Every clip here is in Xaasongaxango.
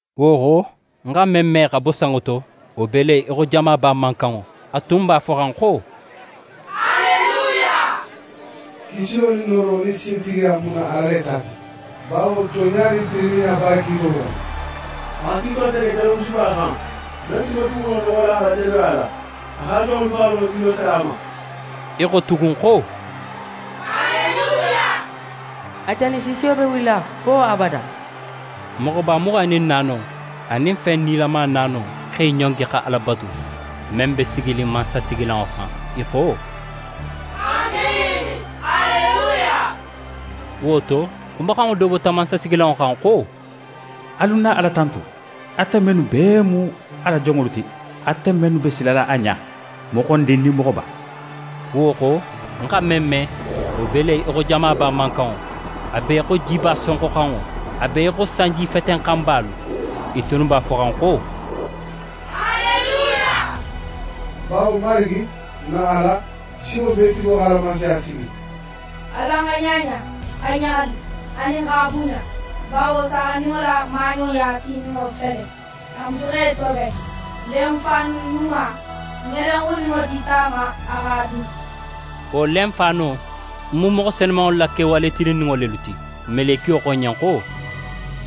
Wo xo, ń xa men me xa bo sanŋo to, wo be le í xo jamaba mankanŋo. A tun b'a foxan xo: «Aleluya! Kisilo nin nooro nin sintigiya mu n na Ala le ta ti. Bawo tonɲa nin tilinninɲa b'a la kiitolu xono. A xa kiito tege jadomusuba xan, men tun be duguxulo noxola a la jadoya la. A x'a la jonŋolu faxalo julo sara a ma.» I xo tugun xo: «Aleluya! A janisiisiyo be wulila fo abada.» Moxoba muxan nin naano anin fen nilama naano x'e ɲongi xa Ala batu, men be siginin mansasigilanŋo xan, i xo: «Amiini! Aleluya!» Wo to, xumaxanŋo do bota mansasigilanŋo xan xo: «Alu n na Ala tantu, ate mennu bee mu a la jonŋolu ti, ate mennu be silala a ɲa, moxondin nin moxoba!» Wo xo, ń xa men me, wo be le í xo jamaba mankanŋo, a be í xo jiba sonxoxanŋo, a be í xo sanjifetenxanbalu. I tunnu b'a foxan xo: «Aleluya! Bawo Marigi, n na Ala, Sinŋobeetigo x'a la Mansaya sigi. Alan xa ɲaɲa, xa ɲaxali anin x'a bunɲa, bawo Saaxandinŋo la maaɲoya sininŋo fele. A musu x'é toben. Lenfaanu ɲuma ŋelenxuninŋo dita a ma a x'a dun.» Wo lenfaano mu moxo senumanŋolu la kewale tilinninŋo lelu ti. Melekiyo xo ń ɲen xo: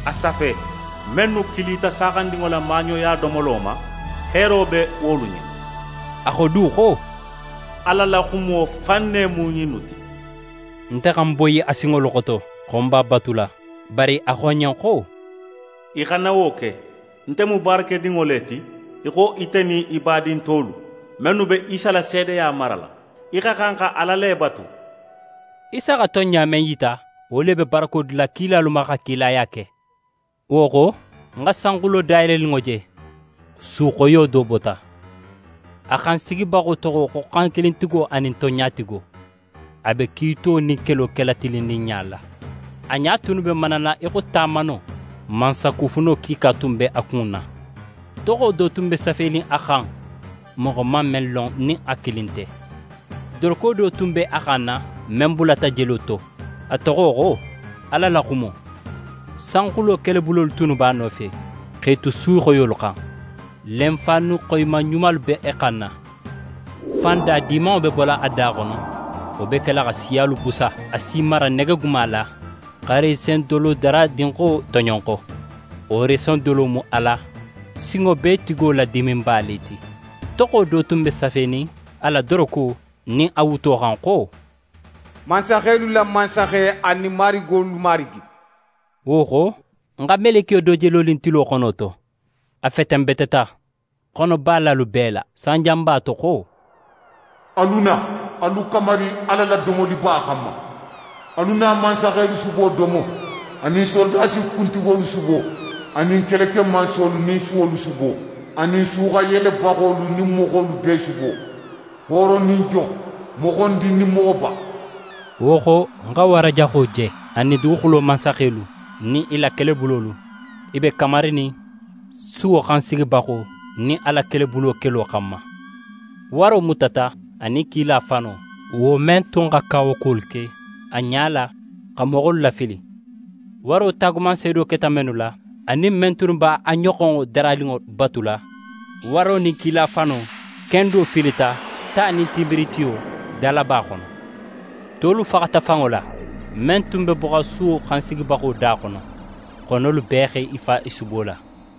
«A safe! Mennu kilita Saaxandinŋo la maaɲoya domolo ma, heero be wolu ɲen!» A xo du xo: «Ala la xumo fan ne mu ɲinnu ti.» Nte xa ń boyi a sinŋolu xoto xo ń b'a batula, bari a xo ń ɲen xo: «Í xana wo ke! Nte mu baarakedinŋo le ti í xo ite nin í badin tolu, mennu be Isa la seedeya marala. Í xa xan xa Ala le batu!» Isa xa tonɲa men yita, wo le be barako dila kilalu ma xa kilaya ke. Wo xo, ń xa sanxulo dayeleninŋo je. Su xoyo do bota. A xan sigibaxo toxo xo Xankilintigo anin Tonɲatigo. A be kiito nin kelo kela tilinninɲa la. A ɲa tunnu be manala í xo tamano, mansakufuno kiika tun be a kunna. Toxo do tun be safenin a xan, moxo man men lon nin a kilin nte. Doroko do tun be a xanna, men bulata jelo to. A toxo xo: «Ala la Xumo». Sanxulo kelebulolu tunnu b'a nofe, x'e tu su xoyolu xan, lenfaanu xoyiman ɲumalu be i xanna. Fan da dimanŋo be bola a da xono, wo be kela xa siyalu busa. A si i mara negeguma la, xa resendolodaradinxo toɲonxo, wo resendolo mu Ala, Sinŋobeetigo la diminba le ti. Toxo do tun be safenin a la doroko nin a wuto xan xo: «Mansaxelu la Mansaxe anin marigolu Marigi». Wo xo, ń xa melekiyo do je lonin tilo xono to. A fetenbeteta xono balalu bee la, sanjanba to xo: «Alu na, alu kamari Ala la domoliba xanma! Alu na mansaxelu subo domo, anin sorodasi kuntigolu subo, anin kelekemansolu nin suwolu subo, anin suxanyelebaxolu nin moxo bee subo, hooro nin jon, moxondin nin moxoba.» Wo xo, ń xa wara jaxo je, anin duguxulo mansaxelu nin i la kelebulolu, i be kamarinin suwo xansigibaxo nin a la kelebulo kelo xanma. Waro mutata, anin kila fano, wo men tun xa kawakuwolu ke a ɲala xa moxolu lafili, waro taagumanseedo keta mennu la, anin men tunnu b'a ɲoxonŋo daraninŋo batula. Waro nin kila fano kendo filita ta nin tinbiritiyo dalaba xono. Tolu faxata fanŋo la, men tun be boxan suwo xansigibaxo da xono. Xonolu bee x'e fa i subo la.